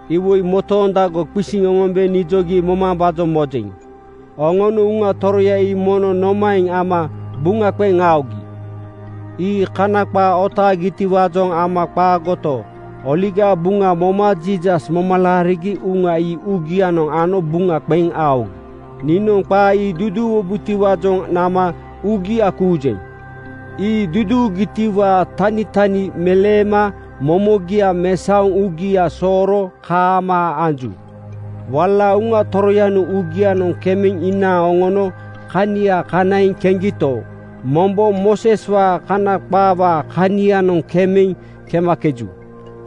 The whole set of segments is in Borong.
Iwoi motoondago qisiŋ oŋombe nijogi momambaajoŋ mojeŋ: Oŋonoŋ Uŋa Toroya ii mono nomaeŋ ama buŋa qeŋ aogi? Ii Kana qaa otaagitiwaajoŋ ama qaagoto, Oligaa Buŋa moma Jiisas moma laarigi Uŋa ii uugianoŋ ano buŋa qeŋ aogi. Niinoŋ qaa ii duduuwubotiwaajoŋ nama uugia kuujeŋ. Ii duduugitiwaa tanitani meleema momogia mesaoŋ uugia sooro kaamaa anju. Wala Uŋa Toroyanoŋ uugianoŋ kemeŋ inaaŋ oŋono kania kanaiŋ keŋgito, mombo Mooseswaa Kana qaawaa kanianoŋ kemeŋ kemakeju.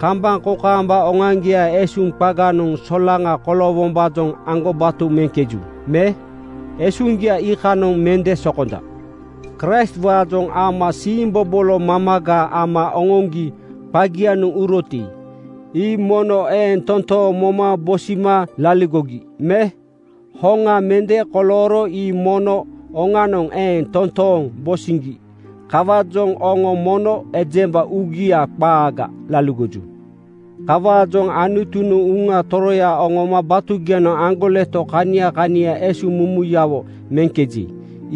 Kambaŋ kokaamba oŋoaŋgiaa esuŋ qaganoŋ solaŋa koloowombaajoŋ aŋgobato meŋkeju me? Esuŋgia iikanoŋ mende sokonja. Kraistwaajoŋ ama siimbobolo mamaga ama oŋoŋgi qagianoŋ uroti, ii mono eeŋ toontooŋ moma bosima laligogi me? Hoŋa mende kolooro ii mono oŋanoŋ eeŋ toontooŋ bosiŋgi. Kawaajoŋ oŋo mono ejemba uugia qaaga laligoju. Kawaajoŋ Anutunoŋ Uŋa Toroya oŋoma batugianoŋ aŋgoleto kania kania esuŋmumuyawo meŋkeji,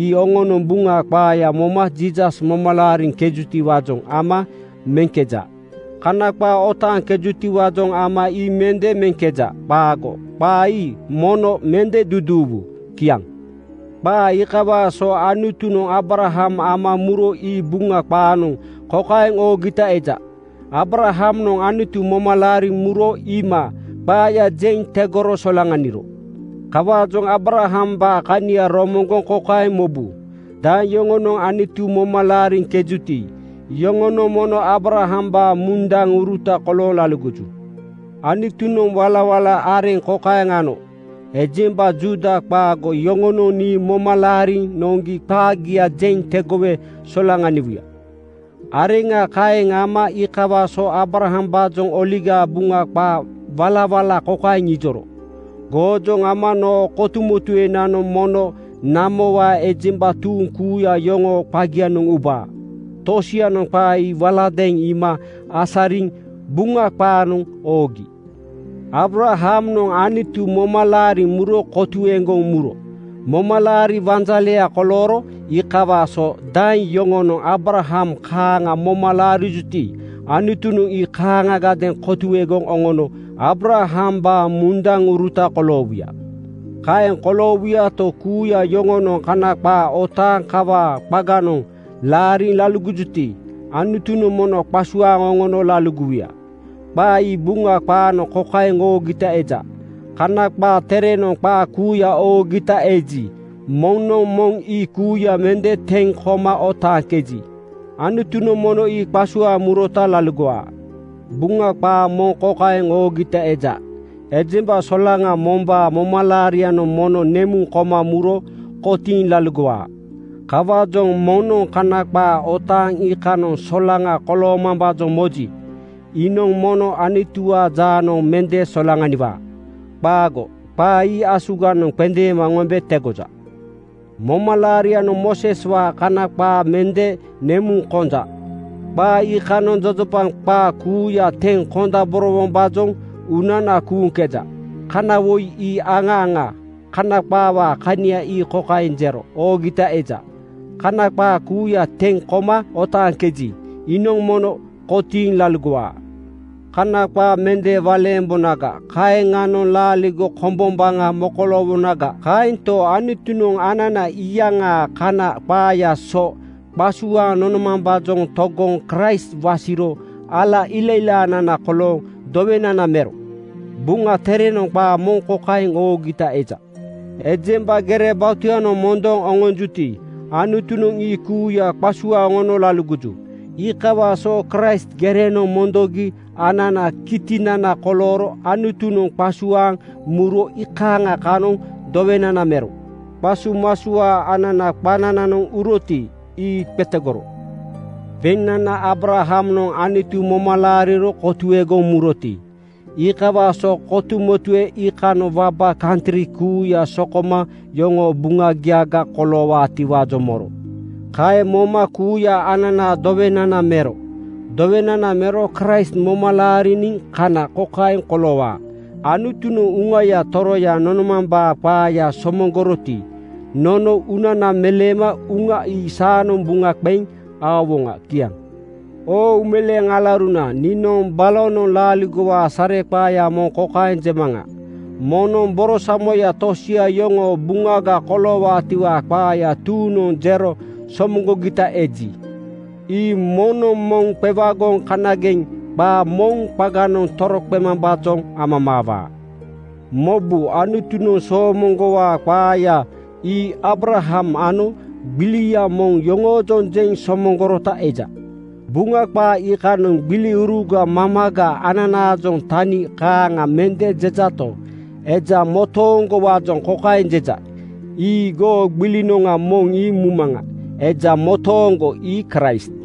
ii oŋonoŋ Buŋa qaaya moma Jiisas moma laariŋkejutiwaajoŋ ama meŋkeja. Kana qaa otaaŋkejutiwaajoŋ ama ii mende meŋkeja. Qaago. Qaa ii mono mende duduuwu. Kiaŋ. Qaa iikawaa so Anutunoŋ Aabraham ama muro ii Buŋa qaanoŋ kokaeŋ oogita eja, “Aabrahamnoŋ Anutu moma laariŋ muro iima qaaya jeŋ tegoro solaŋaniro.” Kawaajoŋ Aabrahambaa kania romoŋgoŋ kokaeŋ mobu: Daeŋ yoŋonoŋ Anutu moma laariŋkejuti, iyoŋonoŋ mono Aabrahambaa mundaŋuruta kolooŋ laligoju. Anutunoŋ walawala areŋa kokaeŋ ano, “Ejemba Juuda qaago yoŋonoŋ nii moma laariŋ noŋgi qaagia jeŋ tegowe solaŋaniwuya.” Areŋa kaeŋ ama iikawaa so Aabrahambaajoŋ Oligaa Buŋa qaa walawala kokaeŋ ijoro, “Goojoŋ ama noo kotuemotuenanoŋ mono namowaa ejemba tuuŋ kuuya yoŋoo qagianoŋ ubaa.” Tosianoŋ qaa ii waladeeŋ iima asariŋ Buŋa qaanoŋ oogi. Aabrahamnoŋ Anutu moma laariŋ muro kotuegoŋ muro momalaariwaa wanjaleya kolooro. Iikawaa so daeŋ yoŋonoŋ Aabraham kaaŋa moma laarijuti, Anutunoŋ ii kaaŋagadeeŋ kotuegoŋ oŋono Aabrahambaa mundaŋuruta koloowuya. Kaeŋ koloowuyato, kuuya yoŋonoŋ Kana qaa otaaŋ kawaa qaganoŋ laariŋ laligojuti, Anutunoŋ mono qasuaaŋ oŋono laligowuya. Qaa ii Buŋa qaanoŋ kokaeŋ oogita eja, “Kana qaa Terenoŋ qaa kuuya oogita eji, moŋnoŋ moŋ ii kuuya mende teŋ koma otaaŋkeji, Anutunoŋ mono ii qasuaaŋ murota laligowaa.” Buŋa qaa moŋ kokaeŋ oogita eja, “Ejemba solaŋa mombaa momalaarianoŋ mono nemuŋ koma muro kotiiŋ laligowaa.” Kawaajoŋ moŋnoŋ Kana qaa otaaŋ iikanoŋ solaŋa koloomambaajoŋ moji, iinoŋ mono Anutuwaa jaanoŋ mende solaŋaniwaa. Qaago. Qaa ii asuganoŋ qendeema oŋombe tegoja. Momalaarinoŋ Mooseswaa Kana qaa mende nemuŋ konja. Qaa iikanoŋ jojopaŋ qaa kuuya teŋ kondaborowombaajoŋ uunana kuuŋkeja. Kana woi ii aŋa aŋa. Kana qaawaa kania ii kokaeŋ jero oogita eja, “Kana qaa kuuya teŋ koma otaaŋkeji, iinoŋ mono kotiiŋ laligowaa.” Kana qaa mende waleembonaga, kaeŋanoŋ laaligo kombombaŋa mokoloowonaga. Kaento, Anutunoŋ anana iyaŋaa Kana qaayaa so qasuaaŋ nonomambaajoŋ togoŋ Kraist wasiro ala ilailaanana kolooŋ dowenana mero. Buŋa Terenoŋ qaa moŋ kokaeŋ oogita eja, “Ejemba gere batuyanoŋ mondoŋ oŋonjuti, Anutunoŋ ii kuuya qasuaaŋ oŋono laligoju.” Iikawaa so Kraist gerenoŋ mondoŋgi ananaa kitinana kolooro Anutunoŋ qasuaaŋ muro iikaaŋa kanoŋ dowenana mero. Qasumasuaa ananaa qanananoŋ uroti, ii qetegoro. Beŋnana Aabrahamnoŋ Anutu moma laariro kotuegoŋ muroti, iikawaa so kotumotue iikanoŋ waba kantri kuuya sokoma yoŋoo buŋagiaga koloowaatiwaajoŋ moro. Kaeŋ moma kuuya ananaa dowenana mero. Dowenana mero Kraist moma laariniŋ kana kokaeŋ koloowaa: Anutunoŋ Uŋaya Toroya nonomambaa qaaya somoŋgoroti, nono uunana meleema Uŋa ii saanoŋ buŋa qeŋ aowoŋa. Kiaŋ. Oo uumeleeŋ alauruna, niinoŋ balonoŋ laaligowaa sareqaaya moŋ kokaeŋ jemaŋa: Moŋnoŋ borosamoya tosia yoŋoo buŋaga koloowaatiwaa qaaya tuuŋnoŋ jero somoŋgogita eji, ii moŋnoŋ moŋ qewagoŋ kanageŋ qaa moŋ qaganoŋ toroqemambaajoŋ amamaawaa. Mobu, Anutunoŋ soomoŋgowaa qaaya ii Aabraham ano gbilia moŋ yoroojoŋ jeŋ somoŋgorota eja. Buŋa qaa iikanoŋ “gbiliuruga” mamaga ananaajoŋ tani kaaŋa mende jejato, eja motooŋgowaajoŋ kokaeŋ jeja, “Ii goo gbilinoŋa moŋ ii mumaŋa.” Eja motooŋgo ii Kraist.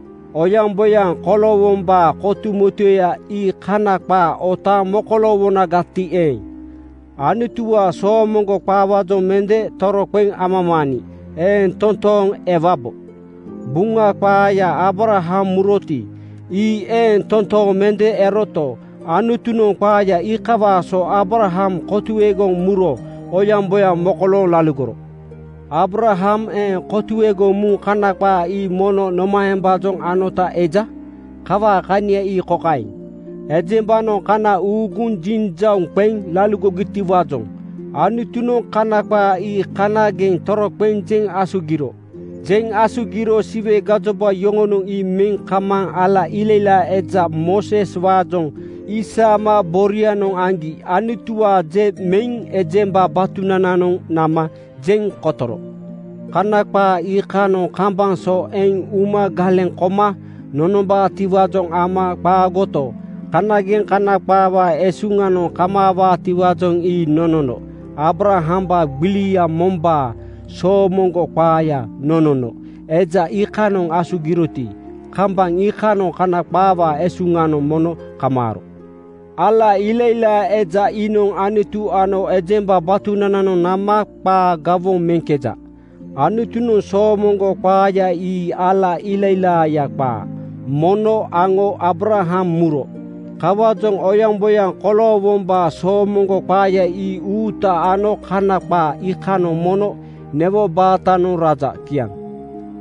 Oyaŋboyaŋ koloowombaa kotumotueya ii Kana qaa otaaŋ mokoloowonagati eeŋ, Anutuwaa soomoŋgo qaawaajoŋ mende toroqeŋ amamaaniŋ eeŋ toontooŋ ewabo. Buŋa qaaya Aabraham muroti, ii eeŋ totooŋ mende eroto, Anutunoŋ qaaya iikawaa so Aabraham kotuegoŋ muro oyaŋboyaŋ mokolooŋ laligoro. Aabraham eeŋ kotuegoŋ muŋ Kana qaa ii mono nomaembaajoŋ anota eja? Kawaa kania ii kokaeŋ: Ejembanoŋ kana uuguŋ jinjauŋ qeŋ laligogitiwaajoŋ Anutunoŋ Kana qaa ii kanageŋ toroqeŋ jeŋ asugiro. Jeŋ asugiro Siwe gajoba yoŋonoŋ ii meŋ kamaaŋ ala ilailaa eja (namel man, mediator) Mooseswaajoŋ isaama borianoŋ aŋgi Anutuwaa je meŋ ejemba batunananoŋ nama jeŋ kotoro. Kana qaa iikanoŋ kambaŋ so eŋ uma galeŋ koma nonombaatiwaajoŋ ama qaagoto, kanageŋ Kana qaawaa esuŋanoŋ kamaawaatiwaajoŋ ii nonono. Aabrahambaa gbili mombaa soomoŋgo qaaya nonono eja iikanoŋ asugiroti, kambaŋ iikanoŋ Kana qaawaa esuŋanoŋ mono kamaaro. Ala ilailaa eja iinoŋ Anutu ano ejemba batunananoŋ nama qaa gawoŋ meŋkeja. Anutunoŋ soomoŋgo qaaya ii ala ilailaaya qaa, mono aŋo Aabraham muro. Kawaajoŋ oyaŋboyaŋ koloowombaa soomoŋgo qaaya ii uuta ano Kana qaa iikanoŋ mono newo baatanoŋ raja. Kiaŋ.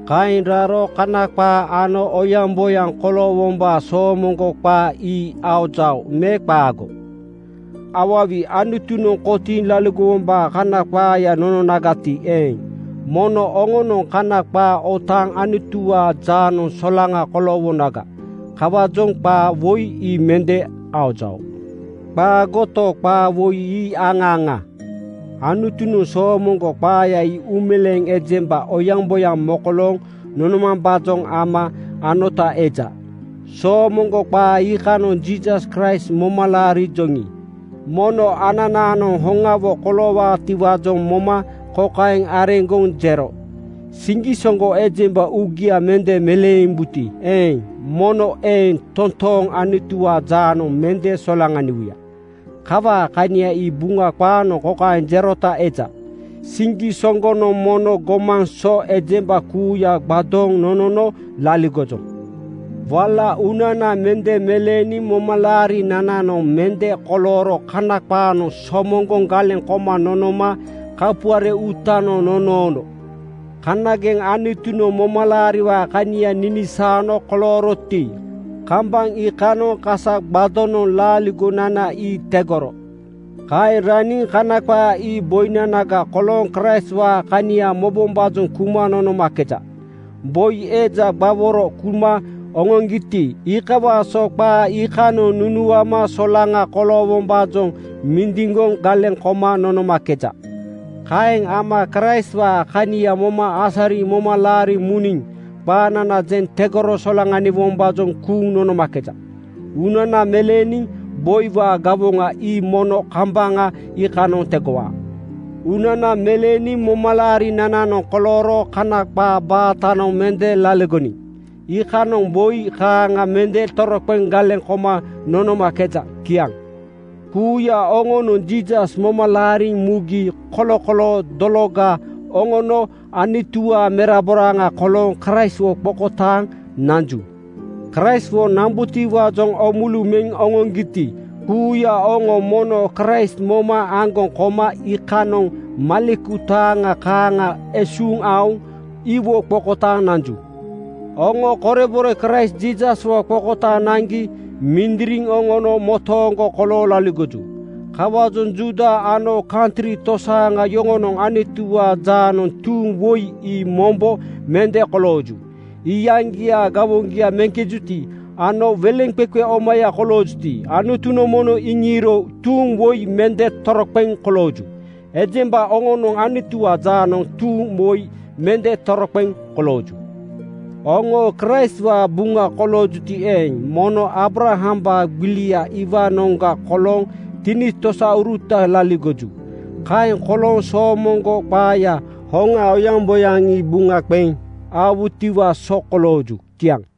Kaeŋ raro Kana qaa ano oyaŋboyaŋ koloowombaa soomoŋgo qaa ii aojao me qaago? Awawi! Anutunoŋ kotiiŋ laligowombaa Kana qaaya nononagati eeŋ, mono oŋanoŋ Kana qaa otaaŋ Anutuwaa jaanoŋ solaŋa koloowonaga. Kawaajoŋ qaa woi ii mende aojao. Qaagoto, qaa woi ii aŋa aŋa. Anutunoŋ soomoŋgo qaaya ii uumeleeŋ ejemba oyaŋboyaŋ mokolooŋ nonomambaajoŋ ama anota eja. Soomoŋgo qaa iikanoŋ Jiisas Kraist moma laarijoŋi, mono ananaanoŋ hoŋawo koloowaatiwaajoŋ moma kokaeŋ areŋgoŋ jero, “Siŋgisoŋgo ejemba uugia mende meleembuti eeŋ, mono eeŋ toontooŋ Anutuwaa jaanoŋ mende solaŋaniwuya.” Kawaa kania ii Buŋa qaanoŋ kokaeŋ jerota eja, “Siŋgisoŋgonoŋ mono gomaŋ so ejemba kuuya gbadooŋ nonono laligojoŋ.” Wala uunana mende meleeniŋ momalaarinananoŋ mende kolooro Kana qaanoŋ somoŋgoŋ galeŋ koma nonoma kapuare uutanoŋ nonoono. Kanageŋ Anutunoŋ momalaariwaa kania ninisaano kolooroti, kambaŋ iikanoŋ kasa gbadonoŋ laaligonana ii tegoro. Kaeŋ raniŋ Kana qaa ii boinanaga kolooŋ Kraistwaa kania mobombaajoŋ kuma nonomakeja. Boi eja gbaworo kuma oŋoŋgiti, iikawaa so qaa iikanoŋ nunuama solaŋa koloowombaajoŋ mindiŋgoŋ galeŋ koma nonomakeja. Kaeŋ ama Kraistwaa kania moma asariŋ moma laariŋ muniŋ qaanana jeŋ tegoro solaŋaniwombaajoŋ kuuŋ nonomakeja. Uunana meleeniŋ boiwaa gawoŋa ii mono kambaŋ iikanoŋ tegowaa. Uunana meleeniŋ momalaarinananoŋ kolooro Kana qaa baatanoŋ mende laligoniŋ iikanoŋ boi kaaŋa mende toroqeŋ galeŋ koma nonomakeja. Kiaŋ. Kuuya oŋonoŋ Jiisas moma laariŋ mugi kolokoloo dologa oŋono Anutuwaa meraboraaŋa kolooŋ Kraistwo qokotaaŋ nanju. Kraistwo nambutiwaajoŋ oomulu meŋ oŋoŋgiti, kuuya oŋo mono Kraist moma aŋgoŋ koma iikanoŋ maleku taaŋa kaaŋa esuuŋ aoŋ iwo qokotaaŋ nanju. Oŋo korebore Kraist Jiisaswo qokotaaŋ naŋgi mindiriŋ oŋono motooŋgo kolooŋ laligoju. Kawaajoŋ Juuda ano kantri tosaaŋa yoŋonoŋ Anutuwaa jaanoŋ tuuŋ woi ii mombo mende kolooju. Iyaŋgiaa gawoŋgia meŋkejuti ano weleŋqeqe omaya koloojuti, Anutunoŋ mono iŋiiro tuuŋ woi mende toroqeŋ kolooju. Ejemba oŋonoŋ Anutuwaa jaanoŋ tuuŋ woi mende toroqeŋ kolooju. Oŋo Kraistwaa buŋa koloojuti eeŋ, mono Aabrahambaa gbilia iwaanoŋga kolooŋ tinitosauruta laligoju. Kaeŋ kolooŋ soomoŋgo qaayaa hoŋa oyaŋboyaŋ ii buŋa qeŋ aowutiwaa so kolooju. Kiaŋ.